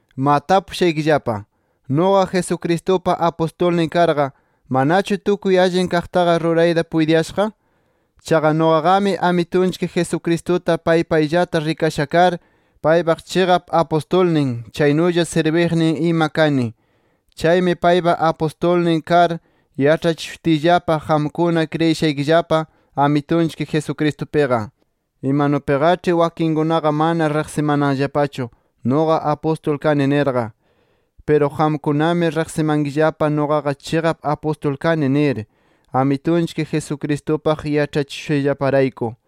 ¡Ma tapushaykillapa! ¿Nuqa, Jesucristupa apustulnin karqa, manachu tukuy allin kaqtaqa rurayta puytiyashaq? Chaqa nuqaqami Amitunchik Jesucristuta pay payllata rikasha kar, paypaq chiqap apustulnin, chaynulla sirbiqnin ima kani. Chaymi paypa apustulnin kar, yaĉhachishutiyllapa qamkuna kriyishaykillapa Amitunchik Jesucristupiqa. Imanupiqaĉhi wakinkunaqa mana riqsimananllapachu nuqa apustul kani nirqa. Piru qamkunami riqsimankillapa nuqaqa chiqap apustul kani nir, Amitunchik Jesucristupaq yaĉhachishushayllaparayku.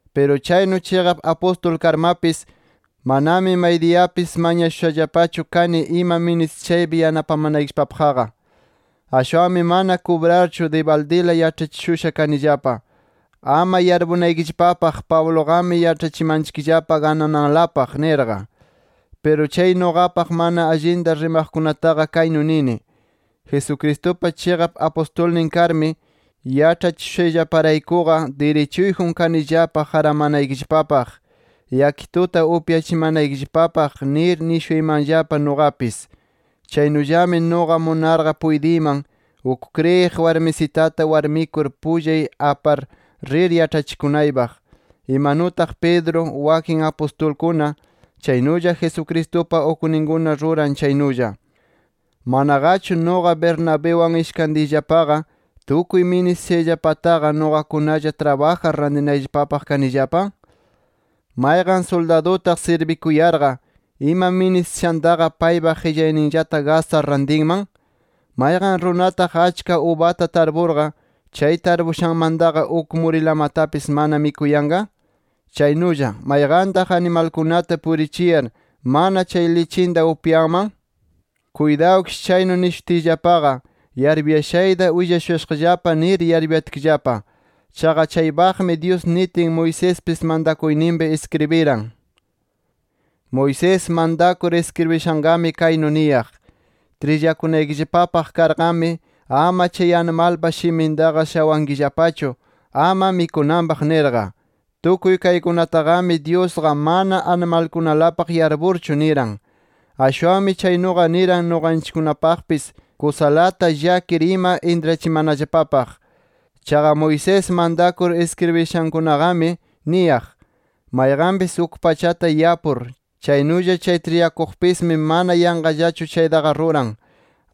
Piru chaynu chiqap apustul karmapis, manami maydiyapis mañashushallapachu kani ima ministishaypi yanapamanaykillapapaqqa. Ashwanmi mana kubrarchu dibaldila yaĉhachishusha kanillapa, ama yarpunaykillapapaq Pabluqami yaĉhachimanchikllapa ganananlapaq nirqa. Piru chay nuqapaq mana allinta rimaqkunataqa kaynu nini: Jesucristupa chiqap apustulnin karmi, yaĉhachishushayllaparaykuqa dirichuyjun kanillapa qaramanaykillapapaq, yakituta upyachimanaykillapapaq nir nishuymanllapa nuqapis. Chaynullami nuqa munarqa puytiyman, uk kriyiq warmisitata warmikur pullay apar rir yaĉhachikunaypaq. Imanutaq Pedro, wakin apustulkuna, chaynulla Jesucristupa ukninkuna ruran chaynulla. ¿Manaqachu nuqa Bernabiwan ishkantiyllapaqa, tukuy ministishayllapataqa nuqakunalla trabajar tarinayllapapaq kanillapa? ¿Mayqan suldadutaq sirbikuyarqa, ima ministishantaqa paypa qillayninllata gastar rantinman? ¿Mayqan runataq achka ubata tarpurqa, chay tarpushanmantaqa uk murinlamatapis mana mikuyanqa? Chaynulla ¿mayqantaq animalkunata purichiyar mana chay lichinta upyanman? Kuytawkish chaynu nishutiyllapaqa, yarpuyashayta willashuyashaqllapa nir yarputkillapa. Chaqa chaypaqqami Dyus nitin, Moisespis mantakuyninpi iskribiran. Moisés mantakur iskribishanqami kaynu niyaq: “Trillakunaykillapapaq karqami, ama chay animalpa shimintaqa shawankillapachu, ama mikunanpaq” nirqa. Tukuy kaykunataqami, Dyusqa mana animalkunalapaq yarpurchu niran. Ashwanmi chaynuqa niran nuqanchikkunapaqpis kusalata llakir ima intrachimanallapapaq. Chaqa Moisés mantakur iskribishankunaqami niyaq: Mayqanpis uk pachata yapur, chaynulla chay trillakuqpismi mana yanqallachu chaytaqa ruran.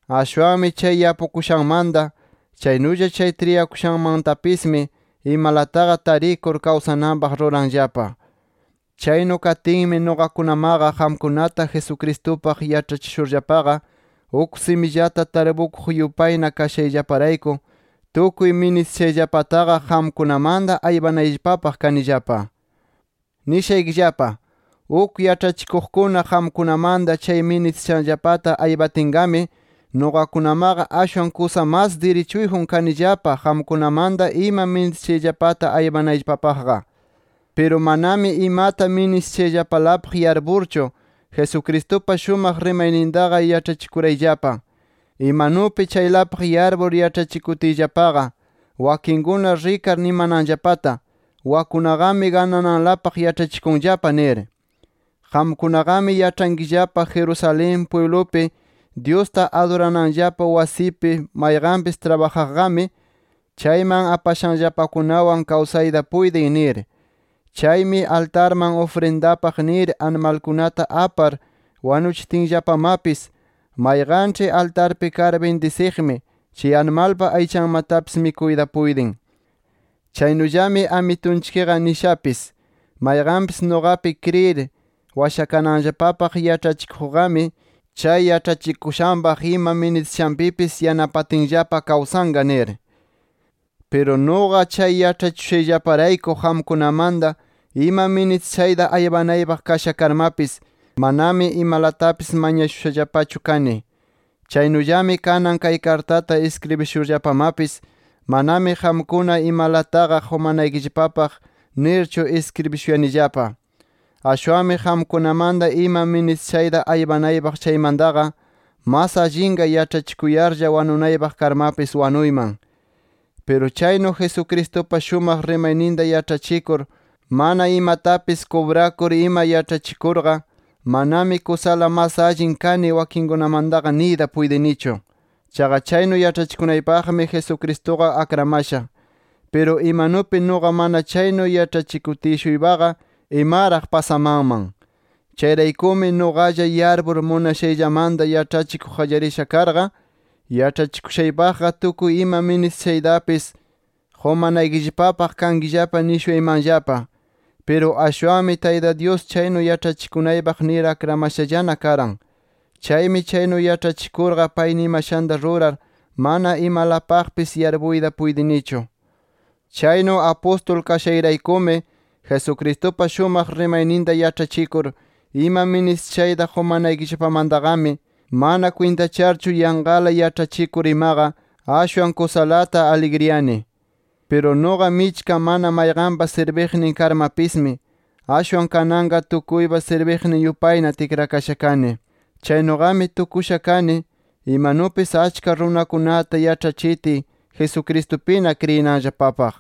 Ashwanmi chay yapukushanmanta, chaynulla chay trillakushanmantapismi imalataqa tarikur kawsananpaq ruranllapa. Chaynu katinmi, nuqakunamaqa qamkunata Jesucristupaq yaĉhachishurllapaqa, uk simillata tarpukuq yupayna kashayllaparayku, tukuy ministishayllapataqa qamkunamanta aypanayllapapaq kanillapa. Nishaykillapa: Uk yaĉhachikuqkuna qamkunamanta chay ministishanllapata aypatinqami, nuqakunamaqa ashwan kusa mas dirichuyjun kanillapa qamkunamanta ima ministishayllapata aypanayllapapaqqa. Piru manami imata ministishayllapalapaq yarpurchu, Jesucristupa shumaq rimaynintaqa yaĉhachikurayllapa. Imanupi chaylapaq yarpur yaĉhachikutiyllapaqa, wakinkuna rikar nimananllapata: Wakkunaqami ganananlapaq yaĉhachikunllapa nir. Qamkunaqami yaĉhankillapa Jerusalén pwiblupi Dyusta adurananllapa wasipi mayqanpis trabajaqqami, chayman apashanllapakunawan kawsayta puytin nir. Chaymi altarman ufrindapaq nir animalkunata apar wanuchitinllapamapis, mayqanĉhi altarpi kar bindisiqmi, chay animalpa aychanmatapis mikuyta puytin. Chaynullami Amitunchikqa nishapis: “Mayqanpis nuqapi kriyir washakananllapapaq yaĉhachikuqqami, chay yaĉhachikushanpaq ima ministishanpipis yanapatinllapa kawsanqa” nir. Piru nuqa chay yaĉhachishushayllaparayku, qamkunamanta ima ministishayta aypanaypaq kasha karmapis, manami imalatapis mañashushallapachu kani. Chaynullami kanan kay kartata iskribishurllapamapis, manami qamkuna imalataqa qumanaykillapapaq nirchu iskribishuyanillapa. ¡Ashwanmi qamkunamanta ima ministiyashayta aypanaypaq chaymantaqa, mas allinqa yaĉhachikuyarlla wanunaypaq karmapis wanuyman! Piru chaynu, Jesucristupa shumaq rimayninta yaĉhachikur mana imatapis kubrakur ima yaĉhachikurqa, manami kusala mas allin kani wakinkunamantaqa niyta puytinichu. Chaqa chaynu yaĉhachikunaypaqmi, Jesucristuqa akramasha. ¡Piru imanupi nuqa mana chaynu yaĉhachikutiy-shuypaqa, imaraq pasamanman! Chayraykumi, nuqalla yarpur munashayllamanta yaĉhachikuq qallarisha karqa, yaĉhachikushaypaqqa tukuy ima ministishaytapis qumanaykillapapaq kankillapa nishuyaymanllapa. Piru ashwanmi Tayta Dyus chaynu yaĉhachikunaypaq nir akramashallana karan. Chaymi chaynu yaĉhachikurqa pay nimashanta rurar mana imalapaqpis yarpuyta puytinichu. Chaynu apustul kashayraykumi Jesucristupa shumaq rimayninta yaĉhachikur ima ministishayta qumanaykillapamantaqami, mana kwintacharchu yanqala yaĉhachikur imaqa ashwan kusalata aligriyani. Piru nuqa, michka mana mayqanpa sirbiqnin karmapismi, ashwan kananqa tukuyta sirbiq yupayna tikrakasha kani. Chaynuqami tukusha kani, imanupis achka runakunata yaĉhachitiy Jesucristupina kriyinanllapapaq.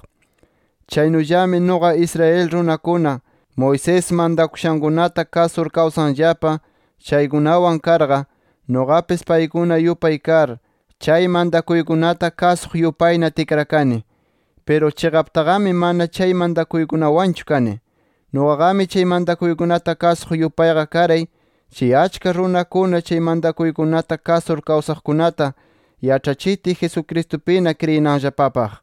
Chaynullami nuqa Israel runakuna, Moisés mantakushankunata kasur kawsanllapa chaykunawan karqa, nuqapis paykuna yupay kar, chay mantakuykunata kasuq yupayna tikrakani. Piru chiqaptaqami mana chay mantakuykunawanchu kani. Nuqaqami chay mantakuykunata kasuq yupayqa karay, chay achka runakuna chay mantakuykunata kasur kawsaqkunata yaĉhachitiy Jesucristupina kriyinanllapapaq.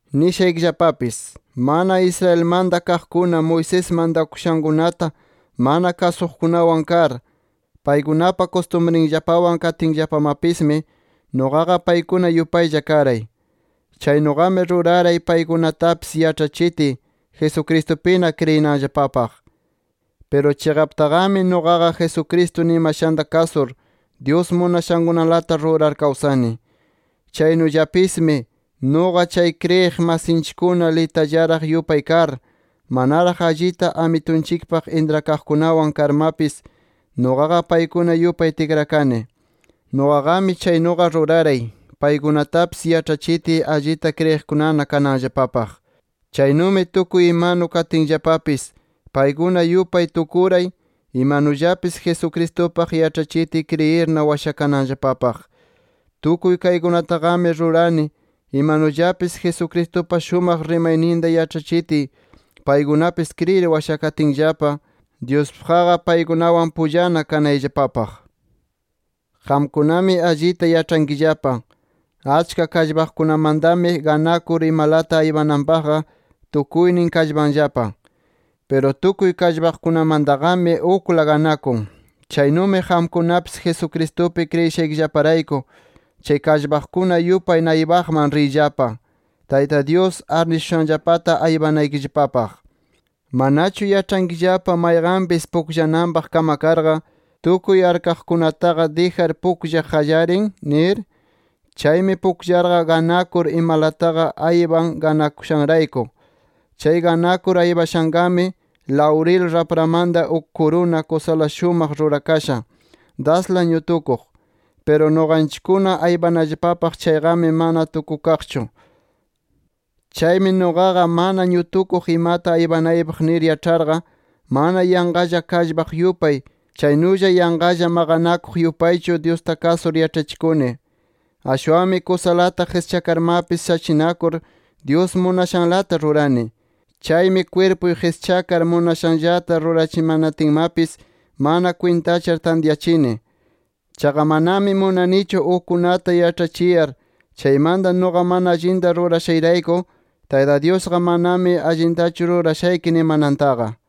Nishaykillapapis: Mana Israelmanta kaqkuna, Moisés mantakushankunata mana kasuqkunawan kar, paykunapa kustumrinllapawan katinllapamapismi, nuqaqa paykuna yupaylla karay. Chaynuqami ruraray paykunatapis yaĉhachitiy, Jesucristupina kriyinanllapapaq. Piru chiqaptaqami nuqaqa, Jesucristo nimashanta kasur, Dyus munashankunalata rurar kawsani. Chaynullapismi, nuqa chay kriyiq masinchikkuna litallaraq yupay kar, manaraq allita Amitunchikpaq intrakaqkunawan karmapis nuqaqa, paykuna yupay tikrakani. Nuqaqami chaynuqa ruraray, paykunatapis yaĉhachitiy, allita kriyiqkunana kananllapapaq. Chaynumi tukuy imanu katinllapapis, paykuna yupay tukuray, imanullapis Jesucristupaq yaĉhachitiy kriyirna washakananllapapaq. Tukuy kaykunataqami rurani, imanullapis Jesucristupa shumaq rimayninta yaĉhachitiy, paykunapis kriyir washakatinllapa, Dyuspaqqa paykunawan pullana kanayllapapaq. Qamkunami allita yaĉhankillapa, achka kallpaqkunamantami ganakur imalata aypananpaqqa tukuynin kallpanllapa. Piru tukuy kallpaqkunamantaqami ukla ganakun. Chaynumi qamkunapis Jesucristupi kriyishaykillaparayku, chay kallpaqkuna yupay naypaqman riyllapa, Tayta Dyus arnishushanllapata aypanaykillapapaq. ¿Manachu yaĉhankillapa, mayqanpis pukllananpaq kamakarqa, tukuy arkaqkunataqa dijar pukllaq qallarin? nir. Chaymi pukllarqa ganakur, imalataqa aypan ganakushanrayku. Chay ganakur aypashanqami, lawril rapramanta uk kuruna kusala shumaq rurakasha, dasla ñutukuq. Piru nuqanchikkuna aypanallapapaq chayqami, mana tukukaqchu. Chaymi nuqaqa, mana ñutukuq imata aypanaypaq nir yaĉharqa, mana yanqalla kallpaq yupay, chaynulla yanqalla maqanakuq yupaychu, Dyusta kasur yaĉhachikuni. Ashwanmi kusalata qischakarmapis shachinakur, Dyus munashanlata rurani. Chaymi kwirpuy qischakar munashanllata rurachimanatinmapis, mana kwintachar tantyachini. Chaqa manami munanichu ukkunata yaĉhachiyar, chaymanta nuqa mana allinta rurashayrayku, Tayta Dyusqa manami allintachu rurashayki nimanantaqa.